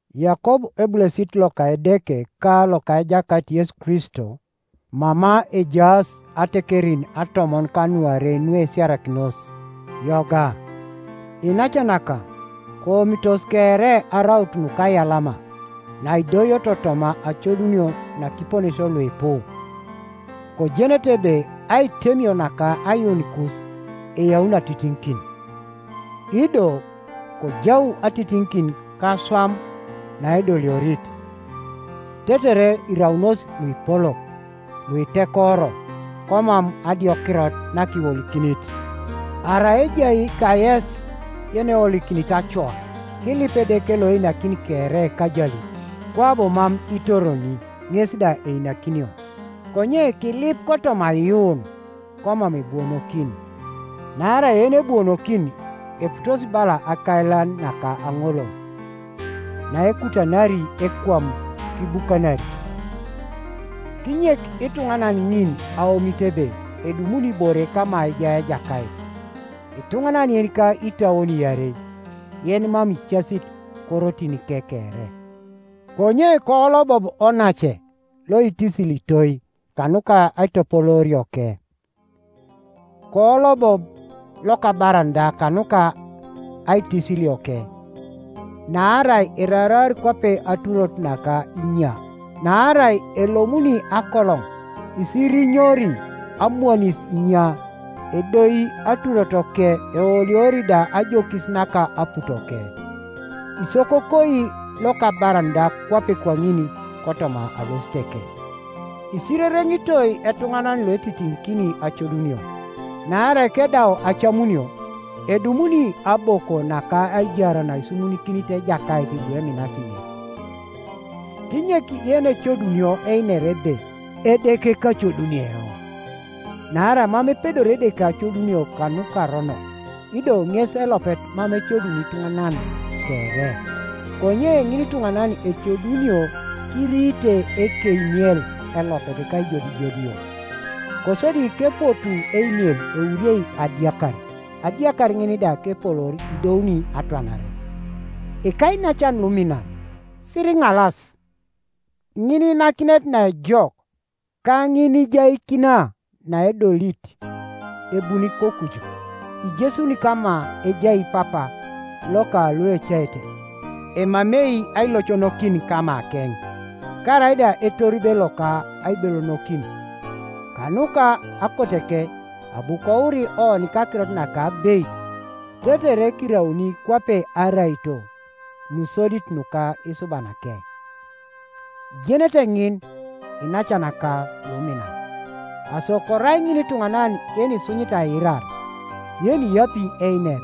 Yakob ebulesit loka Edeke ka loka Ejakait Yesu Kristo, Mama ejaas atekerin atomon kanuarei nuesiarakinos: Yoga. Iinacanaka, koomitos kere araut nukaiyalama, naidoioto toma acodunio nakiponesio luipu, kojenete ebe aitemio naka aiyuunikus eyauni atitiŋikin, Ido kojau atitiŋikin kaswam naedoliorit, tetere iraunos luipolok, luitekoro, komam adiokirot nakiwolikinit. Arai ejai kayes yenewolikinit acoa, kilip Edeke loeinakini kere kajalit, kwabo mam itoroni, ŋes da einakinio. Konye kilip kotoma aiyuun, komam ebuonokin, naarai yenebuonokini eputosi bala akailan naka aŋolol, naekutanari ekwam kibukanari. Kinyek ituŋanan ŋin aomit ebe edumuni ibore kama ejai Ejakait; ituŋanan yenika itauon iarei, yenimam icasit korotinike kere. Konye koolobob onace loitisilitoi kanuka aitopoloorioke, koolobob lokabaran da kanuka aitisilioke, naarai eraraar kwape aturot naka inya. Naarai elomuni akoloŋ isirinyori amwanis inya, edoi aturotoke, eoliori da ajokis naka aputoke. Isokokoi lokabaran da kwape kwaŋin kotoma alositeke. Isirereŋitoi etuŋanan loetitiŋikin acodunio, naarai kedau acamunio, edumuni aboko naka aijar naisumunikinit Ejakait lueminasi ŋes. Kinyek yenecodunio einer ebe, “Edeke kacoduni eoŋ” naarai mam epedori Edeke acodunio kanukaronok, ido ŋes elopet mam ecoduni ituŋanan kere. Konye ŋinituŋanan ecodunio kiriite ekeimiel elopet kaijodijodio, Kosodi kepotuu eimiel euriei adiakar, adiakar ŋin da kepoloor idouni atwanare. Ikainacan luminan, siriŋalas. Ŋiniinakinet naejok, ka ŋiniijaikina naedolit ebuni kokuju, ijesuni kama ejai Papa loka luecaete, emamei ailoconokin kamakeŋ, karaida etoribe loka aibelonokin. Kanuka akoteke abu kouri oni kakirot naka abeit, tetere kirauni kwape araito nusodit nuka isubanake. Ijenete ŋin, iinacanaka luminan. Aso korai ŋinituŋanan yenisunyit aiirar, yeniyapi einer,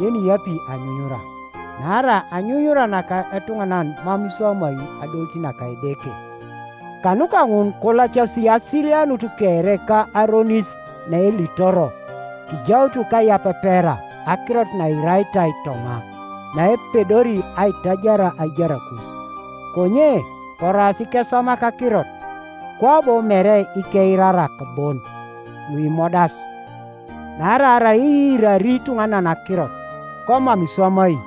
yeniyapi anyunyura, naarai anyunyura naka etuŋanan mam iswamai adolit naka Edeke. Kanuka ŋun kolacasi asilianut kere ka aronis naelitoro, kijaut kaiyapepera akirot nairaitai toma, naepedori aitajar aijarakus. Konye koraas ikeswamak akirot, kwabo mere ikeirarak bon, luimodas. Naarai arai iirari ituŋanan akirot, komam iswamai,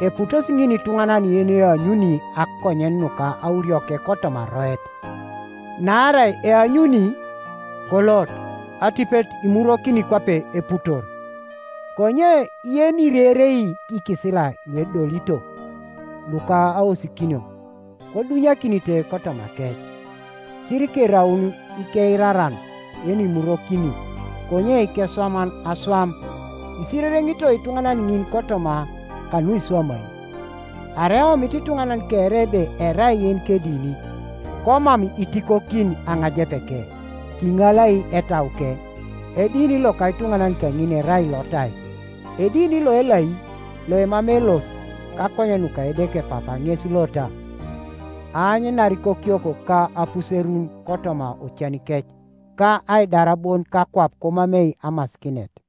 eputosi ŋin ituŋanan yeneanyuni akonyen nuka aurioke kotoma aroet; naarai eanyuni, kolot, atipet imurwokini kwape eputor. Konye yenirerei ikisila luedolito, luka aosikinio, kodunyakinite kotomakec, sirikeraun ikeiraran yenimurwokini, konye ikeswaman aswam, isirereŋitoi ituŋanan ŋin kotoma kanuiswamai. Arai eomit ituŋanan kere ebe erai yenikedini, komam itikokin aŋajepeke, kiŋalai etauke, edini loka ituŋanan kaŋin erai lotai. Edini loelai, loemamei elos kakonyen nuka Edeke Papa ŋes lota: aanyanar ikokiok ka apuserun kotoma ocanikec, ka aidar bon kakwap komamei amasikinet.